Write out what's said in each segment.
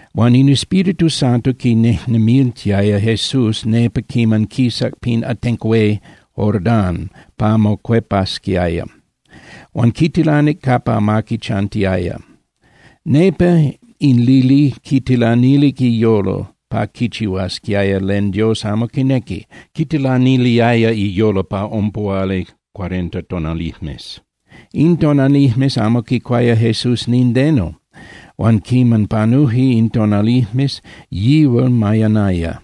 Huan in Espíritu Santo quinejnemiltiaya Jesús nepa quiman quisac pin atenco hué Jordán pa mocuepasquiaya, huan quitilanic capa amaqui chantiaya. Nepa in lili quitilanilic iyolo pa quichihuasquiaya len Dios amo quinequi, quitilaniliaya iyolo pa ompuhuali (cuarenta) tonalijmes. In tonalijmes amo quicuaya Jesús nindeno, huan quiman panuje in tonalijmes, yihual mayanaya.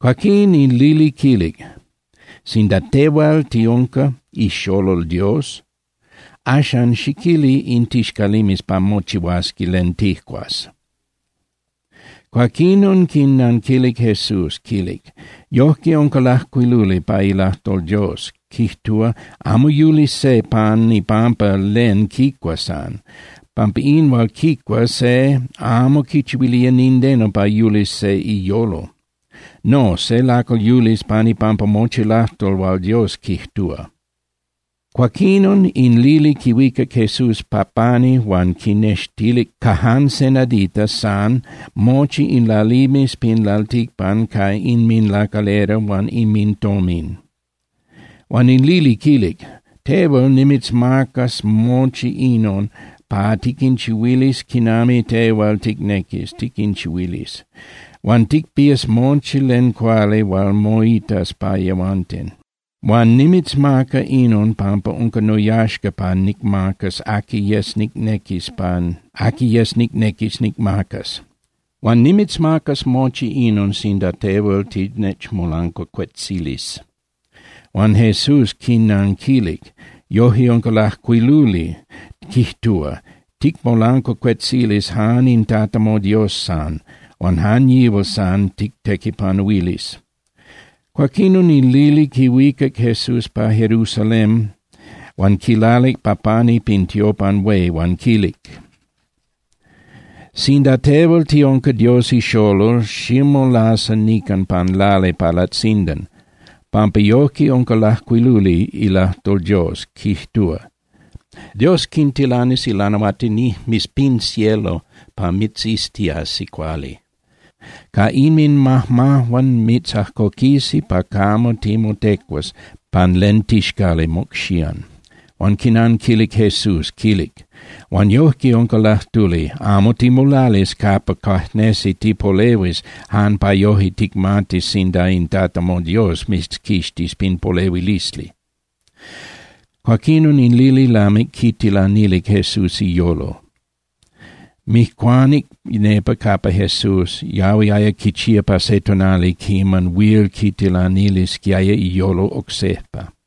Cuaquín in lili quilic: —Sinda tehual tiunca ixolol Dios, axan xiquili in tixcalimes pa mochihuasi len tijcuas. Cuaquinon quinanquilic Jesús, quilic: —Yojque unca lajcuiluli pa ilajtol Dios, quijtúa: “Amo yulis se pan ipampa len quicua san, pampa in hual quicua se amo quichihuilía nindeno pa yulis se iyolo. No, se lacal yulis pan ipampa mochi lajtol hual Dios quijtúa.” Cuaquinon in lili quihuicac Jesús pa pani huan quinextilic ca jan se nadita san mochi in lalimes pin lalticpan ca inminlacalera huan inmintomin. Huan in lili quilic: —Tehual nimitzmacas mochi inon pa tiquinchihuilis quinami tehual ticnequis tiquinchihuilis, huan ticpías mochi len cuali hual moitas pa yehuanten. Huil nimitzmaca inon pampa unca noyaxca pa nicmacas aqui yes nicnequis nicmacas. Huan nimitzmacas mochi inon sinda tehual tinechmolancuacuetzilis. Huan Jesús quinanquilic: —Yojque unca lajcuiluli, quijtúa: “Ticmolancuacuetzilis jan in Tata moDios san, huan jan yihual san tictequipanuilis.” Cuaquinon in lili quihuicac Jesús pa Jerusalén huan quilalic pa pani pin tiopan hué huan quilic: —Sinda tehual tiunca Dios ixolol, ximolasa nican pan lali pa latzindan, pampa yojque unca lajcuiluli ilajtol Dios, quijtúa: Dios quintilanis ilanahuatinijmes pin cielo pa mitziztiasi cuali. Ca inminmajmajuan mitzajcoquisi pa camo timotecuas pan len tixcali mocxían. Huan quinanquilic Jesús, quilic: —Huan yojque unca lajtuli: “Amo timolalis capa cuajnesi tipolehuis jan pa yoje ticmatis sinda in Tata moDios mitzquixtis pin polehuilisli.” Cuaquinon in lili lamic quitilanilic Jesús iyolo, mijcuanic nepa capa Jesús, yahuiaya quichía pa se tonali quiman huil quitilanilisquiaya iyolo oc sejpa.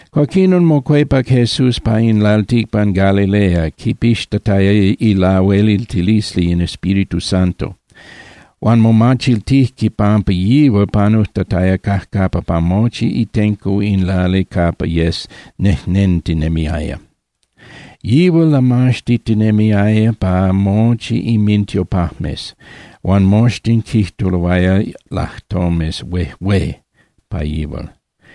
Cuaquinon mocuepac Jesús pa in lalticpan Galilea, quipixtataya ilahueliltilisli in Espíritu Santo. Huan momachiltijque pampa yihual panujtataya cajcapa pa mochi itenco in lali capa yes nejnentinemiaya. Yihual lamaxtitinemiaya pa mochi inmintiopajmes, huan moxtin quijtuloaya lajtomes huejué pa yihual.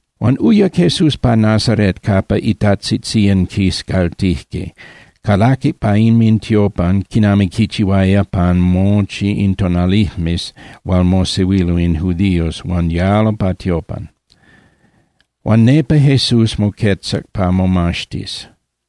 Huan uyac Jesús pa Nazaret capa itajtzitzían quiscaltijque, calaquic pa inmintiopan quinami quichihuaya pan mochi in tonalijmes hual mosehuilo in judíos huan yalo pa tiopan. Huan nepa Jesús moquetzac pa momaxtis.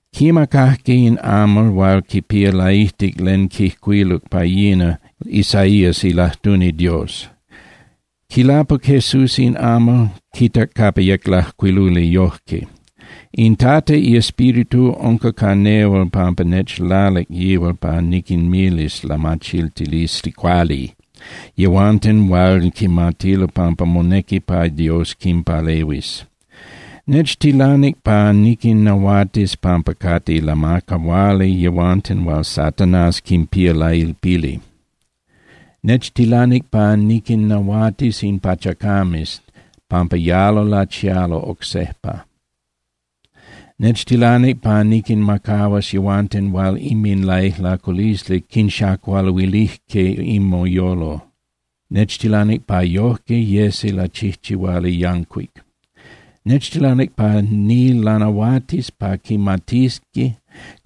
Quimacajque in amal hual quipía laijtic len quijcuiluc pa yina Isaías ilajtuni Dios. Quilapuc Jesús in amal, quitac capa yec lajcuiluli yojque: In Tata iEspíritu unca ca nehual pampa nechlalic yihual pa niquinmilis lamachiltilisli cuali yehuanten hual quimatilo pampa monequi pa Dios quinpalehuis. Nechtilanic pa niquinnahuatis pampa cate lamacahuali yehuanten hual Satanás quinpía lailpili. Nechtilanic pa niquinnahuatis in pachacames pampa yalo lachialo oc sejpa. Nechtilanic pa niquinmacahuas yehuanten hual inminlaijlaculisli quinxacualuilijque inminyolo, nechtilanic pa yojque yesi lachijchihuali yancuic. Nechtilanic pa nilanahuatis pa quimatisqui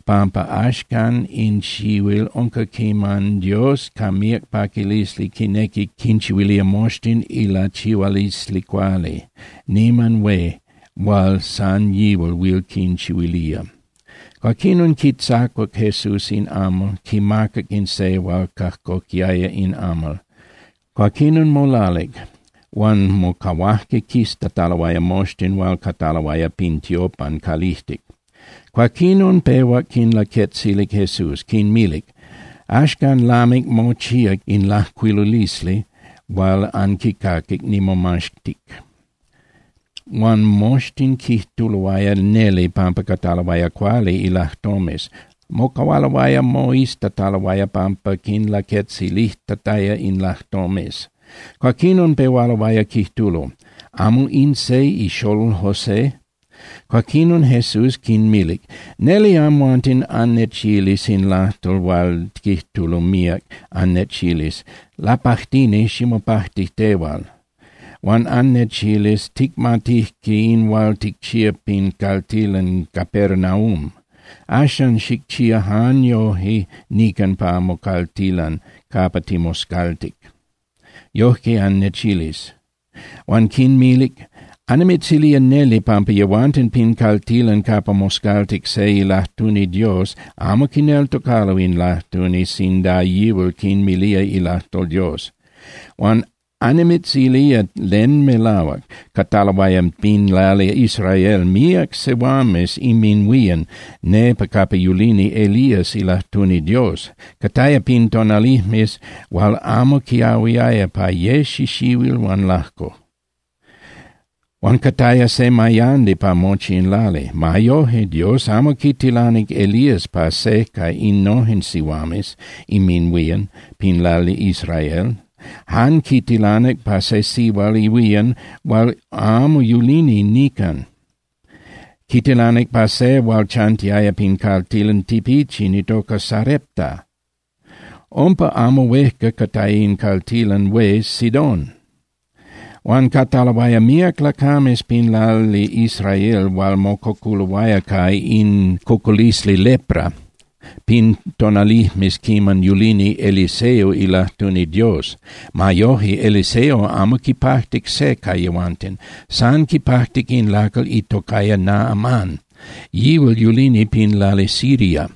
pampa axcan in xihuil unca quiman Dios ca míac paquilisli quinequi quinchihuilía moxtin ilachihualisli cuali niman hué hual san yihual huil quinchihuilía. Cuaquinon quitzacuac Jesús in amal, quimacac in se hual cajcoquiaya in amal, cuaquinon molalic, huan mocahuajque quiztataloaya moxtin hual cataloaya pin tiopan calijtic. Cuaquinon pehuac quinlaquetzilic Jesús, quinmilic: —Axcan lamic mochíac in lajcuilulisli hual anquicaquic nimomaxtic. Huan moxtin quijtuloaya neli pampa cataloaya cuali ilajtomes, mocahualoaya moiztataloaya pampa quinlaquetzilijtataya in lajtomes. Cuaquinon pehualoaya quijtulo: —¿Amo in se ixolol José? Cuaquinon Jesús quinmilic: —Neli amhuanten annechilis in lajtol hual quijtulo míac, annechilis: “Lapajtini, ximopajti tehual.” Huan annechilis: “Ticmatijque in hual ticchíac pin caltilan Capernaúm. Axan xicchía jan yoje nican pa mocaltilan capa timoscaltic.” Yoje annechilis. Huan quinmilic: —Annimitzilía neli pampa yehuanten pin caltilan capa moscaltic se ilajtuni Dios amo quineltocalo in lajtuni sinda yihual quinmilía ilajtol Dios. Huan annimitzilía len melahuac: Cataloaya pin lali Israel míac sihuames inminhuían nepa capa yulini Elías ilajtuni Dios, cataya pin tonalijmes hual amo quiahuiaya pa ye xixihuil huan lajco. Huan cataya se mayandi pa mochi in lali. Ma yoje, Dios amo quitilanic Elías pa se ca innojen sihuames inminhuían pin lali Israel. Jan quitilanic pa se sihual ihuían hual amo yulini nican. Quitilanic pa se hual chantiaya pin caltilan tipichin itoca Sarepta, umpa amo huejca cataya in caltilan hué Sidón. Huan cataloaya míac lacames pin lali Israel hual mococuloaya ca in cocolisli lepra pin tonalijmes quiman yulini Eliseo ilajtuni Dios. Ma yoje, Eliseo amo quipajtic se ca yehuanten. San quipajtic in lacal itocaya Naamán, yihual yulini pin lali Siria.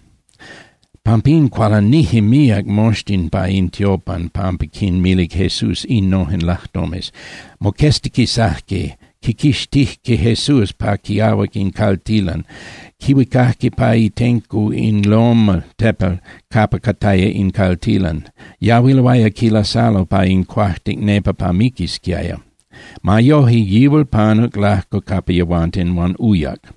Pampín cualanije míac moxtin pa in tiopan pampa quinmilic Jesús innojen lajtomes. Moqueztiquisajque, quiquixtijque Jesús pa quiahuac in caltilan, quihuicajque pa itenco in loma (tepel) capa cataya in caltilan. Yahuiloaya quilasalo pa in cuajtic nepa pa miquisquiaya. Ma yoje, yihual panuc lajco capa yehuanten huan uyac.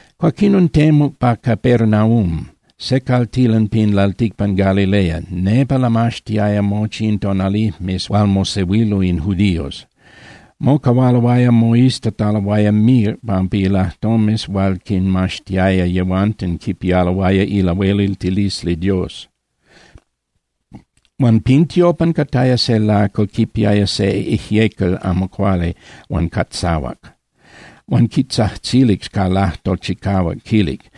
Cuaquinon temuc pa Capernaum, se caltilan pin lalticpan Galilea, nepa lamaxtiaya mochi in tonalijmes hual mosehuilo in judíos. Mocahualoaya moiztataloaya míac pampa ilajtomes hual quinmaxtiaya yehuanten quipialoaya ilahueliltilisli Dios. Huan pin tiopan cataya se lacal quipiaya se ijyecal amo cuali huan catzahuac, huan quitzajtzilic ca lajtol chicahuac, quilic: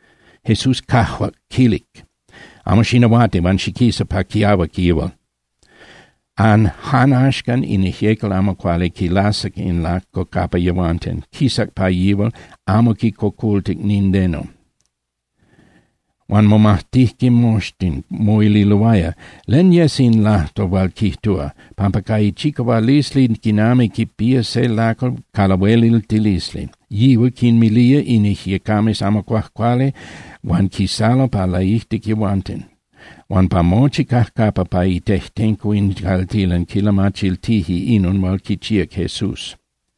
Jesús cajuac, quilic: —Amo xinahuati huan xiquisa pa quiahuac yihual. Jan axcan in ijyecal amo cuali quilasac in lacal lajco capa yehuanten, quisac pa yihual, amo quicocoltic nindeno. Huan momajtijque moxtin, moililoaya: —¿Len yes in lajtol hual quijtúa? Pampa ca ichicahualisli quinami quipía se lacal ca lahueliltilisli, yihual quinmilía in ijyecames amo cuajcuali huan quisalo pa laijtic yehuanten. Huan pa mochi cajcapa pa itejtenco in caltilan quilamachiltije inon hual quichíac Jesús.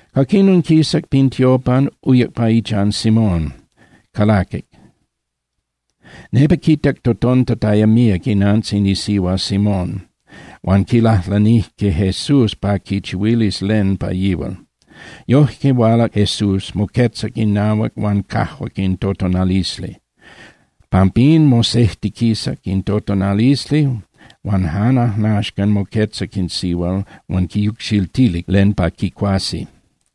Cuaquinon quisac pin tiopan, uyac pa ichan Simón, calaquic. Nepa quitac totontataya míac inantzin isihua Simón huan quilajlanijque Jesús pa quichihuilis len pa yihual. Yoje hualac Jesús, moquetzac inahuac huan cajuac in totonalisli. Pampín mosejtiquisac in totonalisli huan jan ajnaxcan moquetzac in sihual huan quinyucxiltilic len pa quicuasi.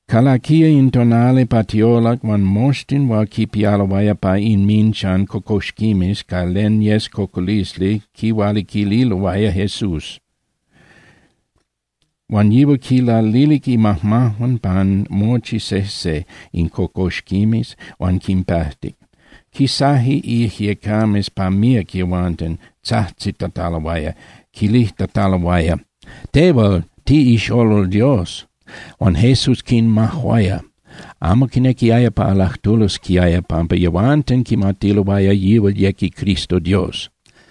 Calaquiaya in tonali pa tiolac huan moxtin hual quipialoaya pa inminchan cocoxquimes ca len yes cocolisli quihualiquililoaya Jesús. Huan yihual quilalilic imajmajuan pan mochi sejse in cocoxquimes, huan quinpajtic. Quisaje ijyecames pa míac yehuanten, tzajtzitataloaya, quilijtataloaya: —Tehual tiꞌixolol Dios. Huan Jesús quinmajuaya, amo quinequiaya pa lajtulosquiaya, pampa yehuanten quimatiloaya yihual yec iCristo Dios.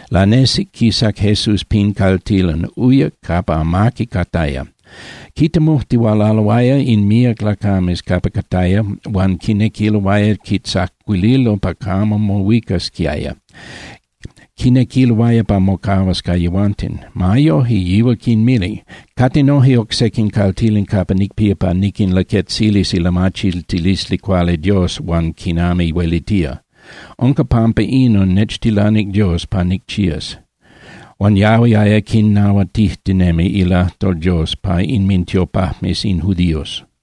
Lanesic, quisac Jesús pin caltilan, uyac capa amaqui cataya. Quitemujtihualaloaya in míac lacames capa cataya huan quinequiloaya quitzacuililo pa camo mohuicasquiaya, quinequiloaya pa mocahuas ca yehuanten. Ma yoje, yihual quinmilic: —Cate noje oc sequin caltilan capa nicpía pa niquinlaquetzilis ilamachiltilisli cuali Dios huan quinami huelitía. Unca pampa inon nechtilanic Dios pa nicchías. Huan yahuiaya quinahuatijtinemi ilajtol Dios pa inmintiopajmes in judíos.